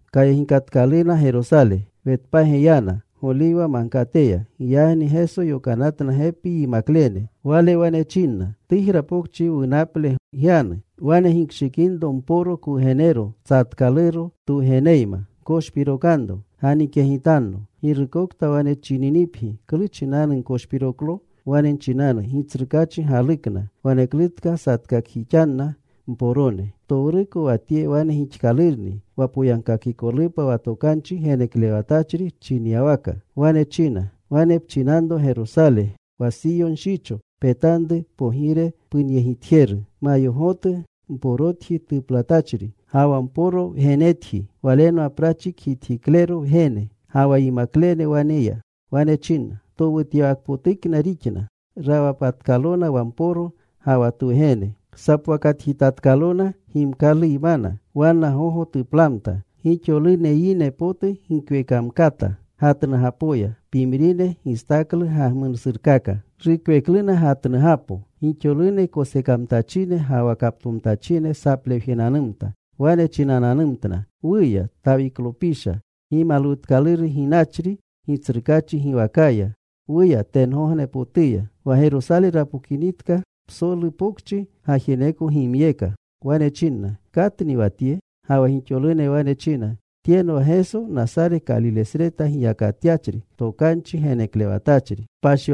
Kayegikatkaluna Gerosale. Wetpage yana, Goliwa Magkateya. Giyagni Geso yokanatna gepi yimaklene. Wale wane chinna, “Tujra pokchi wunaple gyanu. Wane gikshikinro mporo kwugenero tsatkaluro, twugeneyma. Gkoshpirokanro. Ganikyegitanno. Girukokta wane chininipgi, ‘¿Klu chinanu gkoshpiroklo?’ Wane nchinanu, ‘Gitsrukaachi galukna. Waneklutka satkakjixanna mporone.’” Ptowruko wa tye wane gixkalurni wa poyagkakikolupa wa tokanchi geneklewatachri chinyawaka. Wane china: Wane pchinanro Gerosale, wa Siyo nshicho, Petanru Pogire punyegitjeru. Mayogotu, mporotji tuplatachri, ga wa mporo wgenetji. Walenwa prachi kgitjiklero wgene. Ga wa yimaklene wane ya. Wa Geso china towutyawakpotukna rixna. Rawpatkalona wa mporo ga wa twugene. Sapowakatjitatkalona gimkaluyma. Wanna gogo tuplamta. Gixolune yine potu gikwekamkata gatnugapoya. Pimrine gistaklu gagmunasurkaka. Rukwekluna gatnugapo Gixolune kosekamtachine ga wa kaptomtachine saplewjenanumta. Wane chinananumtna: “¡Wuya, Tawiklopisha! ¡Gimalwutkaluru ginachri Gitsrukaachi giwakaya! ¡Wuya tengognepotuya!” Wa Gerosale rapokamtinitka, psolu pokchi gajeneko gimyeka. Wane chinna, “¿Katni wa tye?” Ga wa gixolune wane china, “Tyenwa Geso, Nasare Kalilesreta giyakatyachri, tokanchi geneklewatachri.”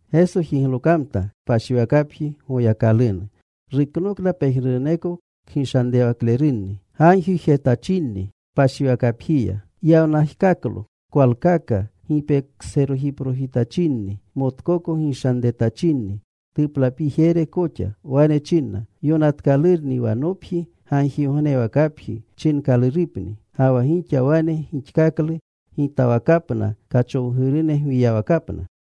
Geso jiglokamta kpashiwakapji Goyakalunu. Ruknokna pejnuruneko kgishanrewaklerunni gagjijetachinni kpashiwakapjiya. Yawnajkaklo kwalkaka gipekoserojiprojitachinni, motkoko gishanretachinni tuplapijere koxa. Wane chinna, “Yonatkalurni: Wa nopji gagjigognewakapji chinkalurupni. Ga wa gixa wane gixatkalu gitawakapna kachowgurune gwiyawakapna.”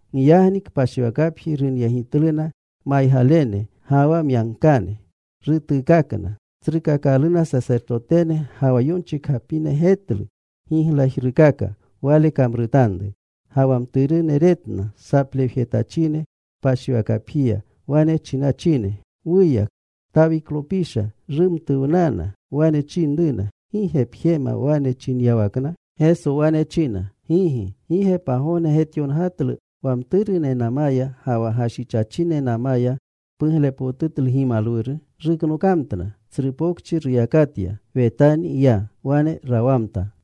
Giyagni kpashiwakapji runyegityaluna maygalene, ga wa myankane. Rutuukakna. Tsrukakalune sasertotene ga wa yonchikgapine getlu giglajrukaka Wale kamrutanru. Ga wa mturune retna saplewjetachine kpashiwakapjiya, wane chinachine, “¡Wuya, Tawiklopisha!” Rumtuwnana. Wane chinruna, “¿Gi ge pjemna wane chinyawakna?” Geso wane china, “Gigi. ¿Gi ge pagogne getyongatlu: Wa mturunenamaya ga wa gashichachinenamaya puglepotutlu gimalwuru?” Ruknokamtna. Tsru pokchi ruyakatya. Wetaniya ya. Wane rawamta.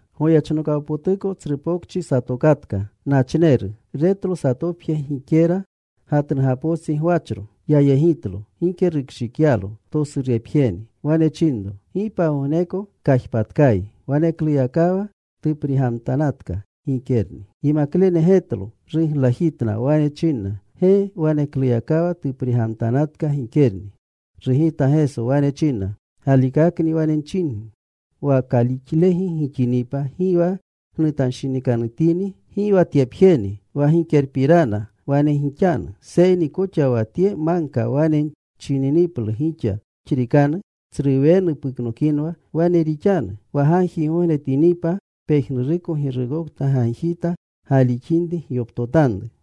Goyechnokawpotuko tsru pokchi satokatka. Nachneru. Retlo satopje gikera gatnugapostsi gwachro. Yayegitlo. Gike rukshikyalo. Tosurepjeni. Wane chinro, “Gi pagogneko kajpatkayi.” Wanekluyakawa tuprigamtanatka gikerni. Yimaklene getlo. Ruglajitna. Wane chinna, “¡Ge! ¡Wanekluyakawa tuprigamtanatka gikerni!” Rugita Geso. Wane chinna, “Galikakni wane nchingi, wa kalixlegi gixinipa, gi wa gnutanshinikanutini, gi wa tyepjeni wa gikerapirana wane gixanu, seyni koxa wa tye magka wane nchininiplu gixa, ‘Puxrikanu. Tsru wenu puknokinwa,’ wane rixanu. Wa gagjigognetinipa pejnuruko girukokta gagjita galixinri, gyoptotanru.”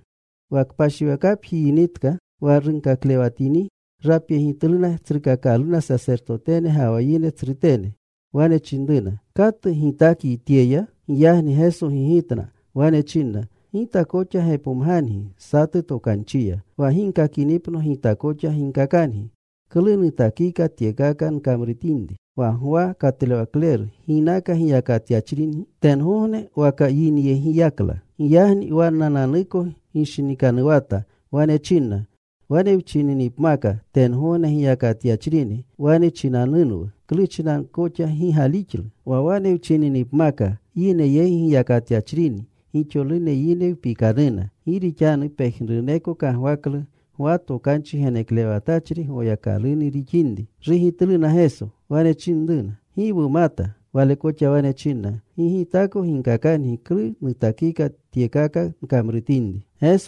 Wa kpashiwakapji yinitka, wa runkaklewanatini, rapyegitluna tsrukakalune sasertotene ga wa yine tsrutene. Wane chinruna, “¿Katu gitakyi tyeya?” Giyagni Geso gigitna. Wane chinna, “Gita koxa gepomgangi satu tokanchiya. Wa ginkakinipno Gita koxa ginkakangi klu nutakika tyekaka nkamrutinri. Wa Gwa katlewle ¿ginaka giyakatyachrini? ¿Tengogne waka yinyegiyakla?” Giyagni wannananuko gishinikanuwata. Wane chinna, “Wane wchininipmaka: Tengogne giyakatyachrini, wane chinanunwu, ‘¿Klu chinanu koxa gi galixlu?’ Wa wane wchininipmaka: Yine yegi giyakatyachrini, gixolune yine wpikanuna. Gi rixanu pejnuruneko kagwaklu Gwa tokanchi geneklewatachri Goyakalunu rixinri.” Rugitluna Geso. Wane chinruna, “Gi wumata.” Wale koxa wane chinna, “Gi Gitako ginkakangi klu nutakika tyekaka nkamrutinri.”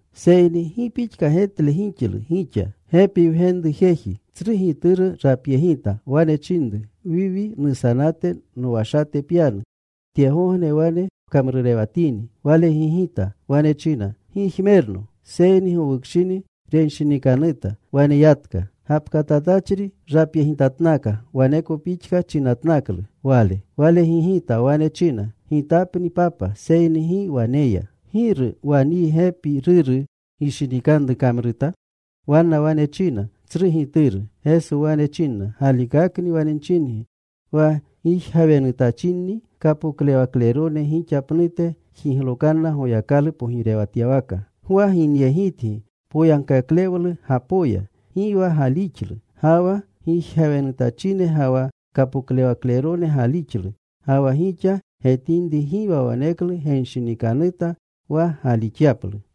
“Seyni ¿gi pixka getle gixlu gixa? Gepi wgenru satu jeji. Tsru gituru rapyegita. Wane chinru, ‘Wiwi, nusanate nowashate pyanu. Tyegogne wane pkamrurewatini.’ “Wale gigita. Wane china, ‘Gi jmerno.’ Seyni gowukshini renshinikanuta. Wane yatka. “Gapkatatachri rapyegitatnaka. Waneko pixka chinatnaklu wale. Wale gigita. Wane china, ‘Gitapni, papa.’ Seyni gi wane ya. “¿Giru wa nyi gepi ruru gishinikanru kamruta?” Wanna wane china, “Tsru gituru.” Geso wane chinna, “Galikakni wane nchingi wa gijgawenutachinni, kapoklewaklerone gixa pnute jiglokanna Goyakalu pogirewatyawaka. Gwa ginyegitgi poyagkaklewlugapoya. Gi wa galixlu. Ga wa gijgawenutachine ga wa kapoklewaklerone galixlu. Ga wa gixa getinri gi wa waneklu genshinikanuta wa galixyaplu.”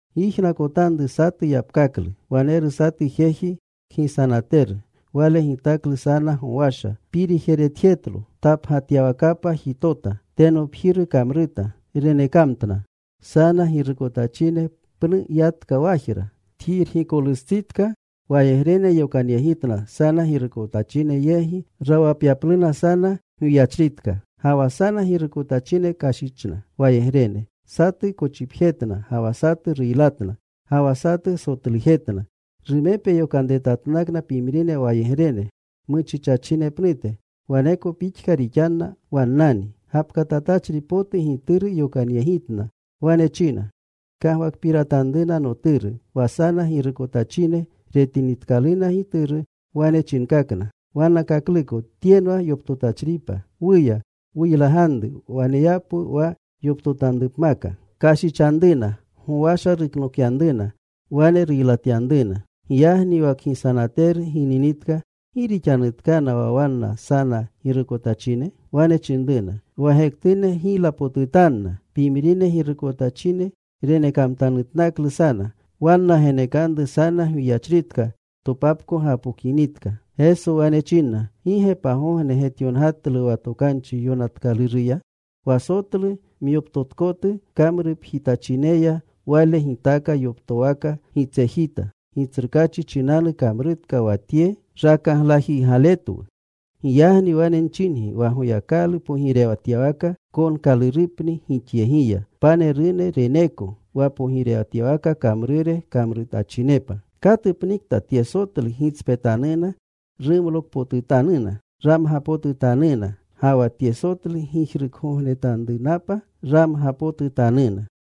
“Gyijnakotanru satu yapkaklu. Waneru satu jeji kgisanateru. Wale gitaklu sana gowasha. Pirijeretjetlo. Tapgatyawakapa jitota. Tenopjiru kamruta. Renekamtna sana girukotachine. Pnu yatka wajra. Tjirgikolustsitka wayegrene yokanyegitna sana girukotachine yegi rawapyapluna sana gwiyachritka. “Ga wa sana girukotachine kashichna wayegrene. Satu kochipjetna, ga wa satu ruylatna, ga wa satu sotlujetna. Rumepe yokanretatnakna pimrine wayegrene muchichachine pnute. Waneko pixka rixkanna wannani. Gapkatatachri potu gituru yokanyegitna. Wane china, ‘Kagwakpiratanruna noturu.’ Wa sana girukotachine retinitkaluna gituru, wane chinkakna wannakakluko, ‘Tyenwa yoptotachripa. Wuya. Wuylaganru. Waneyapwu wa yoptotanrupmaka.’ “Kashichanruna. Gowasha ruknokyanruna. Wane ruylatyanruna. “Giyagni wa kgisanateru gininitka, ¿gi rixanutkana wa wanna sana girukotachine?” Wane chinruna, “Wa gektune ruylapotutanna. Pimrine girukotachine renekamtanutnaklu sana. Wanna genekanru sana gwiyachritka topapko gapokinitka.” Geso wane chinna, “¿Gi ge pagogne getyongatlu wa Tokanchi Yonatkaluruya? Wa sotlu myoptotkotu kamrupjitachineya Wale gitaaka yoptowaka gitsejita. Gitsrukaachi chinanu kamrutka wa tye. Rakaglajiygaletwu. “Giyagni wane nchingi, wa Goyakalu pogirewatyawaka konkalurupni gixyegiya. Panerune reneeko wa pogirewatyawaka kamrure kamrutachinepa. Katupnikta tye sotlu gitspetanuna rumlokpotutanuna, ramgapotutanuna. Ga wa tye sotlu gijrukgogotanrunapa ramgapotutanuna.”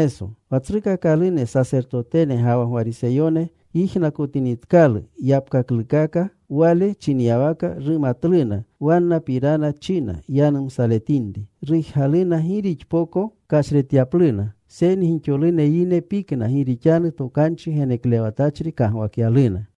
Wa tsrukakalune sasertotene ga wa Gwariseyone yijnakotinitkalu yapkaklukaka Wale chinyawaka, rumatluna wannapirana china yanumsaletinri. Rujgaluna gi rixpoko kashretyapluna, seyni gixolune yine pikna, gi rixanu tokanchi geneklewatachri kagwakyaluna.